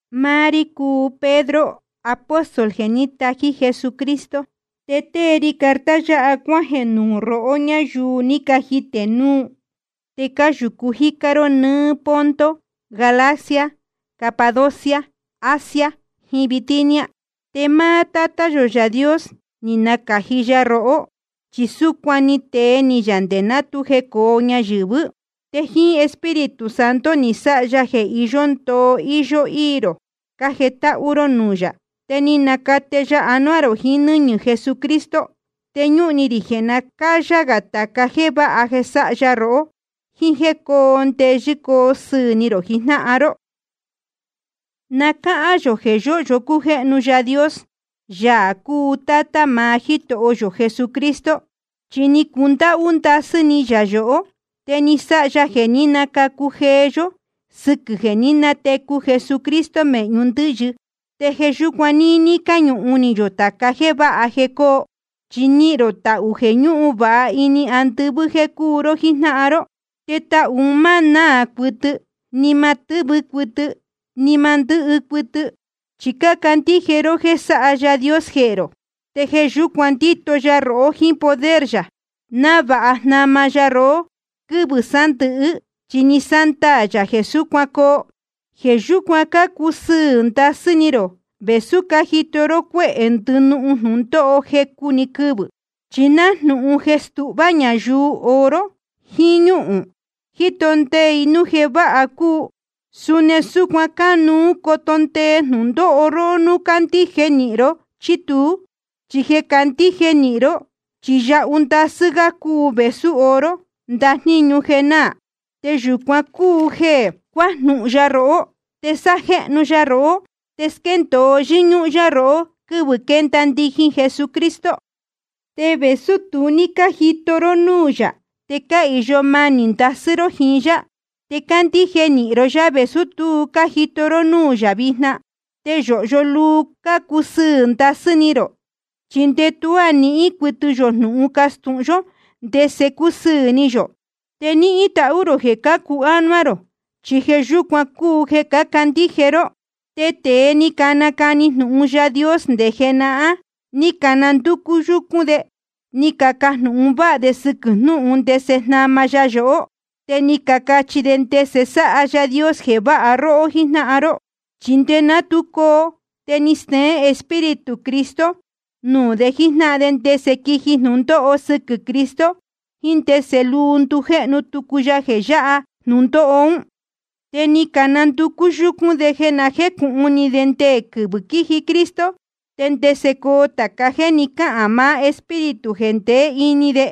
Máá rí cúu Pedro, apóstol jeē ní tají Jesucristo, te tée ri carta yáha cuájeē nuū rohó ñáyuu ní cajitē núu, te cáyūcu jícá ró nɨ́ɨ́ Ponto, Galacia, Capadocia, Asia, jiín Bitinia. Te máá Tátá yō Yaā Dios ni nacāji ya rohó, chi súcuan ni tee ni yā nde ná tu jecōo ñayɨ̄vɨ́. Te jíín Espíritu Santo ni sáha ya jeē iyó ndoo íyó íī rō cájetáhú ró núū yā, te ni nacate ya anuá rō jiín nɨ́ñɨ̄ Jesucristo. Te ñúhun ni rī jeē na cáyá gā tāca jéē váha jeē sáha ya rohó, jíín jéē coo ndeyɨ́ coo sɨɨ̄ ni rō jijnáhan ró. Na cáhán yō jeē yóhyo cújéhnu Yaā Dios, Yaā cúu Tátá maá Jítoho yō Jesucristo. Chi ni cundáhú ndasɨ́ ni yā yohó, te ni sáha ya jeē ní nacacu jeé yó, sɨquɨ̄ jeē ní natecu Jesucristo mēhñu ndɨ́yɨ. Te jeē yúcuan níní cáñuhun ni yō tāca jéē váha jeē coo. Chi nihīn rō tahū jeē ñúhun vāha ini andɨvɨ́ jeē cúu ró jíjnáhan ró. Te tahū un má náā cuɨtɨ, ni ma tɨ́vɨ cuɨtɨ, ni ma ndɨ́hɨ cuɨtɨ. Chi cácandíje ró jéē sáha Yaā Dios jehē rō, te jeē yúcuan ndíto ya rohó jíín poder yā, návāha jnama ya rohó quɨ́vɨ̄ sándɨ̄hɨ́, chi ni sándaā yā jeē súcuan coo. Jeē yúcuan cácusɨɨ̄ ndasɨ́ ni rō, vēsú cájito ró cuéhē ndɨnuū jnūndóho jecu‑ni quɨvɨ̄. Chi nájnūhun jeē stuhvá ñayuu oro jiín ñúhūn, jíto ndee i núu jeē váha cúu, suni súcuan cánuú coto ndee jnūndóho róhó núu cácandíje nīhin ró chí tuú. Chi jeē cácandíje nīhin ró, chi yahu ndasɨ́ gá cúu vēsú oro, ndajníñu jeē náā. Te yūcuan cúu jeē cuajnúhún yá rohó, te sájéhnu ya rohó, te squéndōo yɨ́ñúhún yá rohó quɨ́vɨ̄ quenda ndijin Jesucristo. Te vēsú tu ní cájito ró núū yā, te cáhīyo manī ndasɨ́ ró jíín yá. Te cácandíje nīhin ró yá vēsú tu cájito ró núū yā vijna. Te yōhyo luu cácusɨɨ̄ ndasɨ́ ni rō, chi nde tuá níhín cuɨtɨ yō jnūhun castūhun yó ndese cúsɨɨ̄ ni yō. Te nihīn tahú rō jeē cācu ánuá rō, chi jeē yúcuan cúu jeē cácandíje ró. Te tēe ni canacani jnūhun Yaā Dios nde jenahán, ni cananducú yúcún de ni cacajnūhun váha de sɨquɨ̄ jnūhun ndese jnama ya yohó. Te ni cacachi de ndese sáha Yaā Dios jeē váha róhó jíjnáhan ró. Chi nde ná tu coo, te ni steén Espíritu Cristo nuū de jíjnáhan de ndese quiji jnūndóho sɨquɨ̄ Cristo jiín ndese luu ndujéhnu tucu ya jeē yáha jnūndóho ún. Te ni cananducú yúcún de jeē na jécūhun ni de ndé quɨ́vɨ̄ quiji Cristo te ndese coo tāca jéē ni cáhān maá Espíritu jeē ndeé ini de.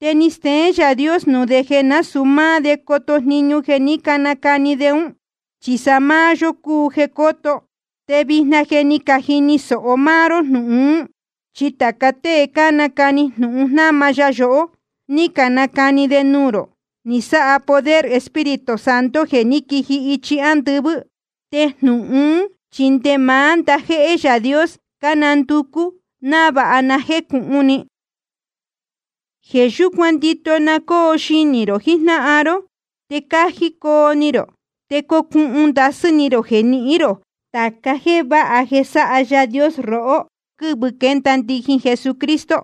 Te ni steén Yaā Dios nuū de jeē násūu máá de coto jniñu jeē ní canacani de ún, chi sa máá yó cúu jeē cóto. Te vijna je ni cajini sōho máá ró jnūhun ún, chi tāca tée nácani jnūhun jnáma ya yohó, ni canacani de nuū rō, ni sáha poder Espíritu Santo jeē ní quiji ichi andɨvɨ́. Te jnūhun ún chi nde maá ndajéhé Yaā Dios cánanducú návāha na jécūhun ni. Jeē yúcuan ndito na cóo xinī rō jijnáhan ró, te cájí coo ni rō. Te cocuhun ndasɨ́ ni rō jeē nihín rō tāca jéē váha jeē sáha Yaā Dios rohó quɨ́vɨ̄ quenda ndijin Jesucristo.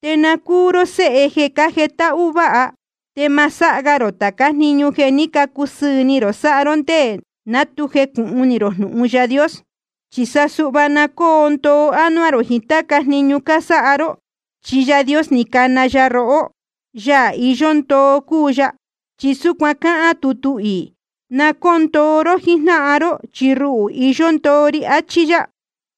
Te na cúu ró séhe jeē cájetáhú váha. Te ma sáha ga rō tācá jniñu jeē ní cacusɨɨ̄ ni rō sáha ró nde ná tu jecūhun ni rō jnūhun Yaā Dios. Chi sa suhva na cóo ndoo ánuá rō jiín táca jniñu cásáha ró, chi Yaā ní cana róhó, Yaā iyó ndoo cúu ya. Chi súcuan cáhán tutu iī: Na cóo ndoo ró jíjnáhan ró, chi ruhū iyó ndoo ri, achí yá.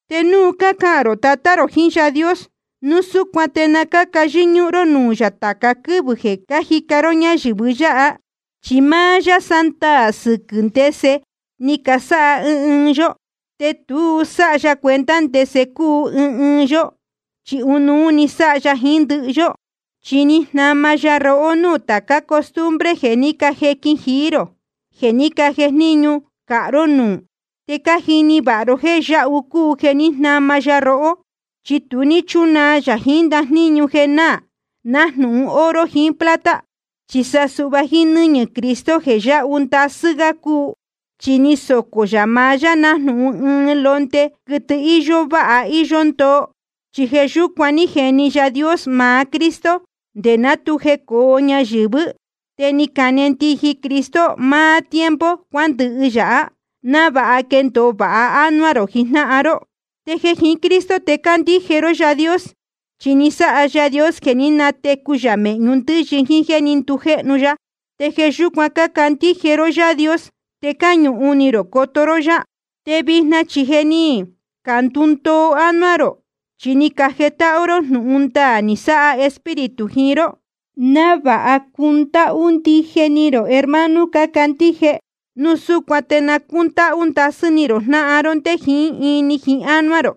Te núu cácahān rō Tatá rō jiín Yaā Dios, núu súcuan te na cáca yɨ́ñúhún ró nuū yā tāca quɨ́vɨ̄ jéē cájica ró ñayɨ̄vɨ yáha. Chi máá yá sándaā sɨquɨ̄ ndese ni casáha ɨɨn ɨɨn yó, te tu sáha ya cuenta ndese cúu ɨɨn ɨɨn yó, chi ɨnuú sáha ya jiín ndɨhɨ yó. Chi ni jnama ya rohó núū tācá costumbre jeē ní cajequin jií rō, jeē ní cajejníñu cāha ró núū. Te cájini vāha ró jéē yahu cúu jeē ní jnama ya rohó. Chi tu ní chúnaa yā jiín ndajníñu jeē náā, nájnūhun oro jiín plata, chi sa suhva jíín nɨ́ñɨ̄ Cristo jeē yáhu ndasɨ́ gá cúu. Chi ni socō yā maá yá nájnūhun ɨɨn londe, quɨtɨ íyó váha íyó ndoo. Chi jeē yúcuan ní jeni Yaā Dios maá Cristo nde ná tu jecōo ñayɨ̄vɨ́, te ni cane ndijin Cristo maá tiempo cuándɨhɨ yáha, návāha quendōo vāha ánuá rō jijnáhan ró. Te jeē jiín Cristo te cácandíje ró Yaā Dios. Chi ni sáha Yaā Dios jeē ní natecu yā mēhñu ndɨ́yɨ jíín jéē ní ndujéhnu ya. Te jeē yúcuan cácandíje ró Yaā Dios, te cáñuhun ni rō coto ró yá. Te vijna chi je ni candundoo ánuá rō, chi ni cajetáhú ró jnūhun ndaā ni sáha Espíritu jiín ró, návāha cundáhú ndije ni rō hermano cácandíje. Núu súcuan te na cúndáhú ndasɨ́ ni rō jnáhan ró nde jiín ini jiín ánuá rō.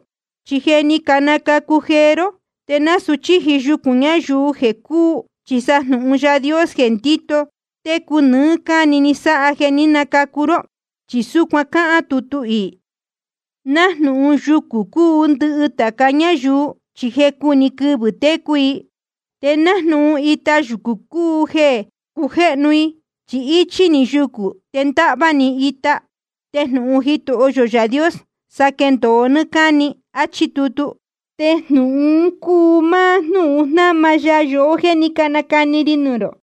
Chi je ni canacacu jeé ró, te nasūu chíji yucūn ñayuu jeē cúū. Chi sa jnūhun Yaā Dios jeē ndíto técu nɨɨ́ cáni ni sáha jeē ní nacacu ró. Chi súcuan cáhán tutu iī: Nájnūhun yucū cúu ndɨhɨ tāca ñáyuu, chi jecu‑ni quɨvɨ̄ técu i. Te nájnūhun ita yucū cúu jeē cujéhnu i. Chi íchí‑ni yucū, te ndáhvá‑ni ita. Te jnūhun Jitoho yō Yaā Dios, sa quéndōo nɨ́ɨ́ cáni. Achí tutu. Te jnūhun un cúu máá jnúhun jnáma ya yohó jéē ní canacani ri nuū rō.